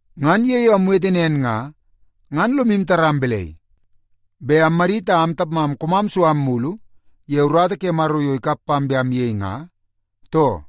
Ngan ye yo amwete nen nga, ngan lomu taram balai, bet ammadit a am tapmam koomam su am mulu ye urata ke Maro yo ikap pam bet amyei nga, too?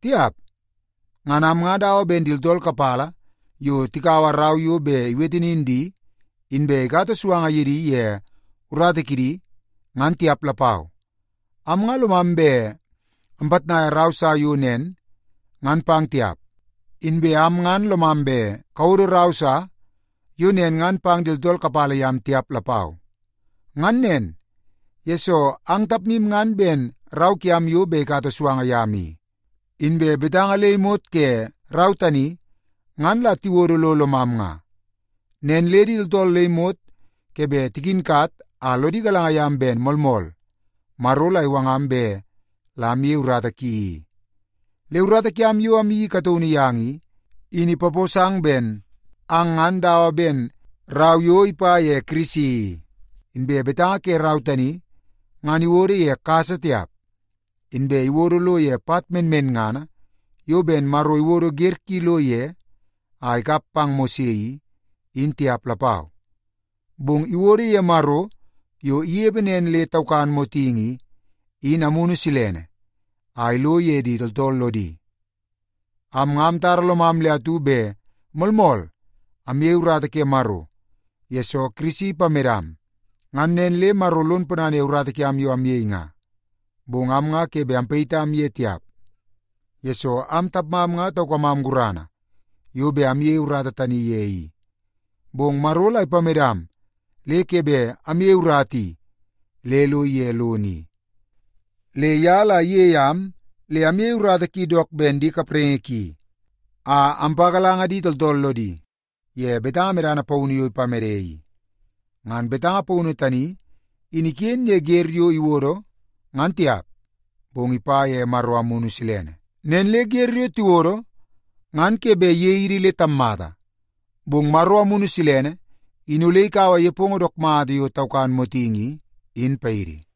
Tiap! Ngan am nga dawa ben di tooltool kapala yo tikaua rau yo bet iwete nin di, inbe ikata suanga ye di ye urata kidi ngan tiap lapau. Am nga lomam bet ampitnaia rau sa yo nen ngan pang tiap, inbe am ngan lomam bet kawodo rau sa yo nen ngan pang di tooltool kapala yam tiap lapau. Ngan nen, yesoo ang tapmu nga ben rau kiam yo bet ikata suanga yam i. Inbe betanga le imot ke rau tani ngan la tiwodo lo lomam nga, nen le di tooltool le imot ke bet tikinkat a lodi galanga yam ben moolmool Maro la iwangam bet la amyei urata ki i. Le urata kiam yo amyeii kataunu yang i, in ipaposang ben ang ngan dawa ben rau yo ipa ye Kirisi i. Inbe betanga ke rau tani, ngan iwodo ye kasa tiap, inbe iwodo lo ye pat menmenngana yo ben Maro iwodo wer ki lo ye a ikap pang Mose i, in tiap lapau, bong iwodo ye Maro, yo inepe nen le taukan motingi i, in Amunu Silene a ilo ye di tooltool lodi. Am nga amtara lomam le atu bet moolmool amyei urata ke Maro, yesoo Kirisi ipamedam, ngan nen le Maro lon ponana ye urata kiam yo amyei nga. Bong am nga ke bet amyitmakam ye tiap, yesoo am tapmam nga taukamam gurana yo bet amyeie urata tani ye i. Bong Maro la ipamedam le ke bet amyeie urata i le ige lono i. Le ye la iyei am le amyei urata ki dook ben di kapraingi ki, a ampagalanga di tooltool lodi ye betanga medana paunu yo ipamede i. Ngan betanga paunu tani in iken ye wer yo tiwodo ngan tiap, bong ipa ye Maro Amunu Silene. Nen le wer yo tiwodo, ngan ke bet iyei idi le tammata, bong Maro Amunu Silene in ole ikaua nepongo dook mata yo taukan motingi i, in paidi.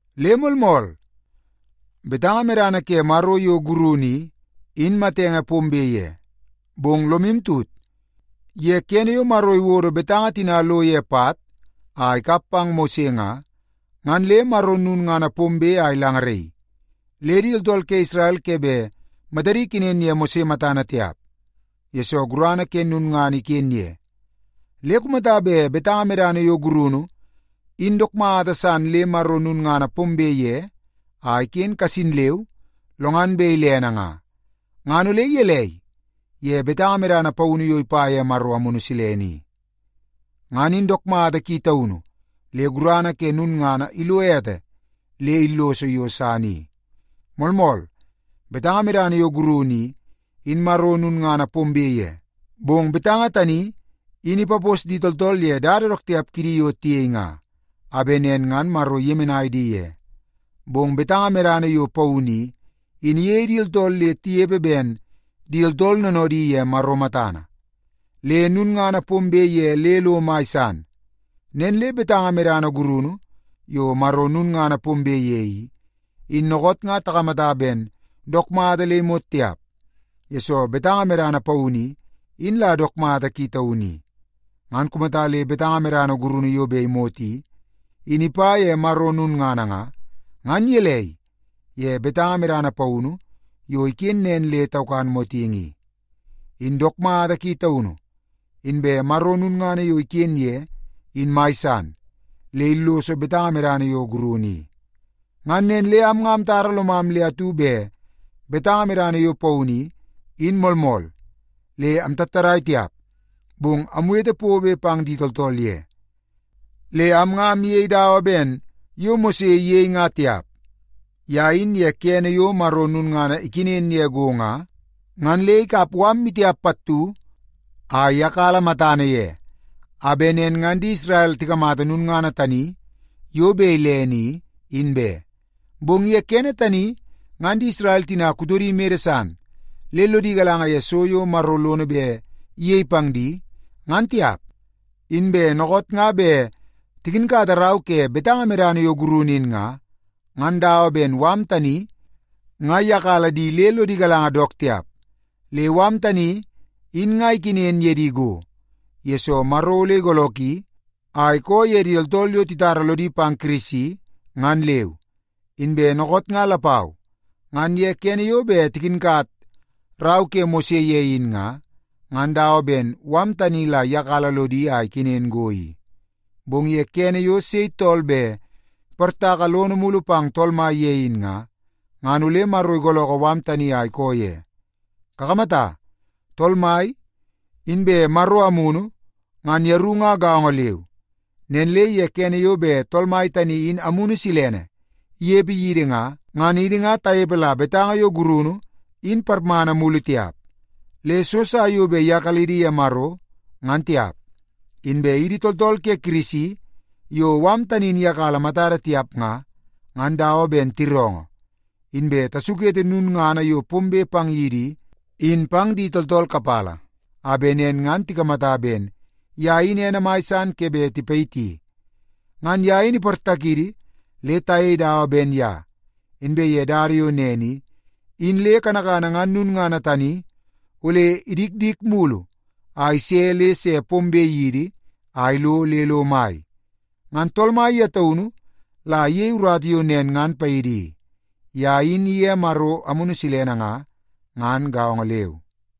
Le moolmool, betanga medana ke Maro yo gurunu i, in matenge pombe ye. Bong lomu tut, ye kene yo Maro iwodo betanga tina lo ye pat a ikap pang Mose nga, ngan le Maro lulngana pombe a ilangaraii, le di tooltool ke Isrel ke bet matadi ikenen ye Mose matana tiap, yesoo gurana ke lulngana iken ye. Le kumata bet betanga medana yo gurunu, in dook mata san le Maro lulngana pombe ye a iken kasin leu, lo ngan bet ilene nga, ngan ole gelei ye betanga medana paunu yo ipa ye Amunu Silene i? Ngan in dook mata ki taunu le gurana ke lulngana ilo ete le illoso yo san i. Moolmool, betanga medana yo gurunu i, in Maro lulngana pombe ye, bong betanga tani in ipapos di tooltool ye dada dook tiap kidi yo tiyei nga, a bet nen ngan Maro iyemenai di ye. Bong betanga medana yo paunu i, in iyei di tooltool le tinepe ben di tooltool noonoodi ye Maro matana. Le lulngana pombe ye le lo mai san. Nen le betanga medana gurunu yo Maro lulngana pombe ye i, in dookoot nga takamata ben dook mata le imot tiap, yesoo betanga medana paunu i, in la dook mata ki taunu i. Ngan kumata le betanga medana gurunu yo bet imot i, in ipa ye Maro lulngana nga, ngan gelei ye betanga medana paunu yo iken nen le taukan motingi i? In dook mata ki taunu, inbe Maro lulngana yo iken ye in mai san, le illoso betanga medana yo gurunu i. Ngan nen le am nga amtara lomam le atu bet betanga medana yo paunu i, in moolmool, le amtattadai tiap, bong amwete pobe pang di tooltool ye. Le am nga amyei dawa ben yo Mose iyei nga tiap. Ye in ye kene yo Maro lulngana ikenen ye go nga, ngan le ikap mala maitiap pattu a iyakala matana ye, a bet nen ngan di Isrel tikamata lulngana tani yo bet ilene i, in be. Bong ye kene tani, ngan di Isrel tina kutodi mede san, le lodi galanga ye so yo Maro lono bet iyei pang di, ngan tiap. Inbe dookoot nga bet tikinkata rau ke betanga medana yo gurunu in nga, ngan dawa ben mala tani nga iyakala di le lodi galanga dook tiap. Le mala tani in nga ikenen ye di go, yesoo Maro ole igoolooki a ikoo ye di tooltool yo titara lodi pang Kirisi, ngan leu. Inbe dookoot nga lapau, ngan ye kene yo bet tikinkat rau ke Mose ye in nga, ngan dawa ben mala tani la iyakala lodi a ikenen go i. Bong ye kene yo sei tool bet iportaka lono mulu pang Tool Mai ye in nga, ngan ole Maro igoolookoo mala tani a ikoo ye. Kakamata, Tool Mai inbe Maro Amunu, ngan yeru nga gaongo leu. Nen le ye kene yo bet Tool Mai tani in Amunu Silene inepe yidi nga, ngan idi nga tanepe la betanga yo gurunu, in parmana mulu tiap, le so sa yo bet iyakalidi ye Maro, ngan tiap. Inbe idi tooltool ke Kirisi yo mala tani in iyakala matada tiap nga, ngan dawa ben tiroongoo, inbe tasukete lulngana yo pombe pang yidi i, in pang di tooltool kapala a bet nen ngan tikamata ben ye in ene mai san ke bet tipayiti. Ngan ye in iportakidi le tayei dawa ben ye. Inbe ye dada yo nen i, in le kanakana ngan lulngana tani ole idikdik mulu a ise le se pombe yidi a ilo le lo mai. Ngan Tool Mai ye taunu la iyei urata yo nen ngan paidi i. Ye in iye Maro Amunu Silene nga, ngan gaongo leu.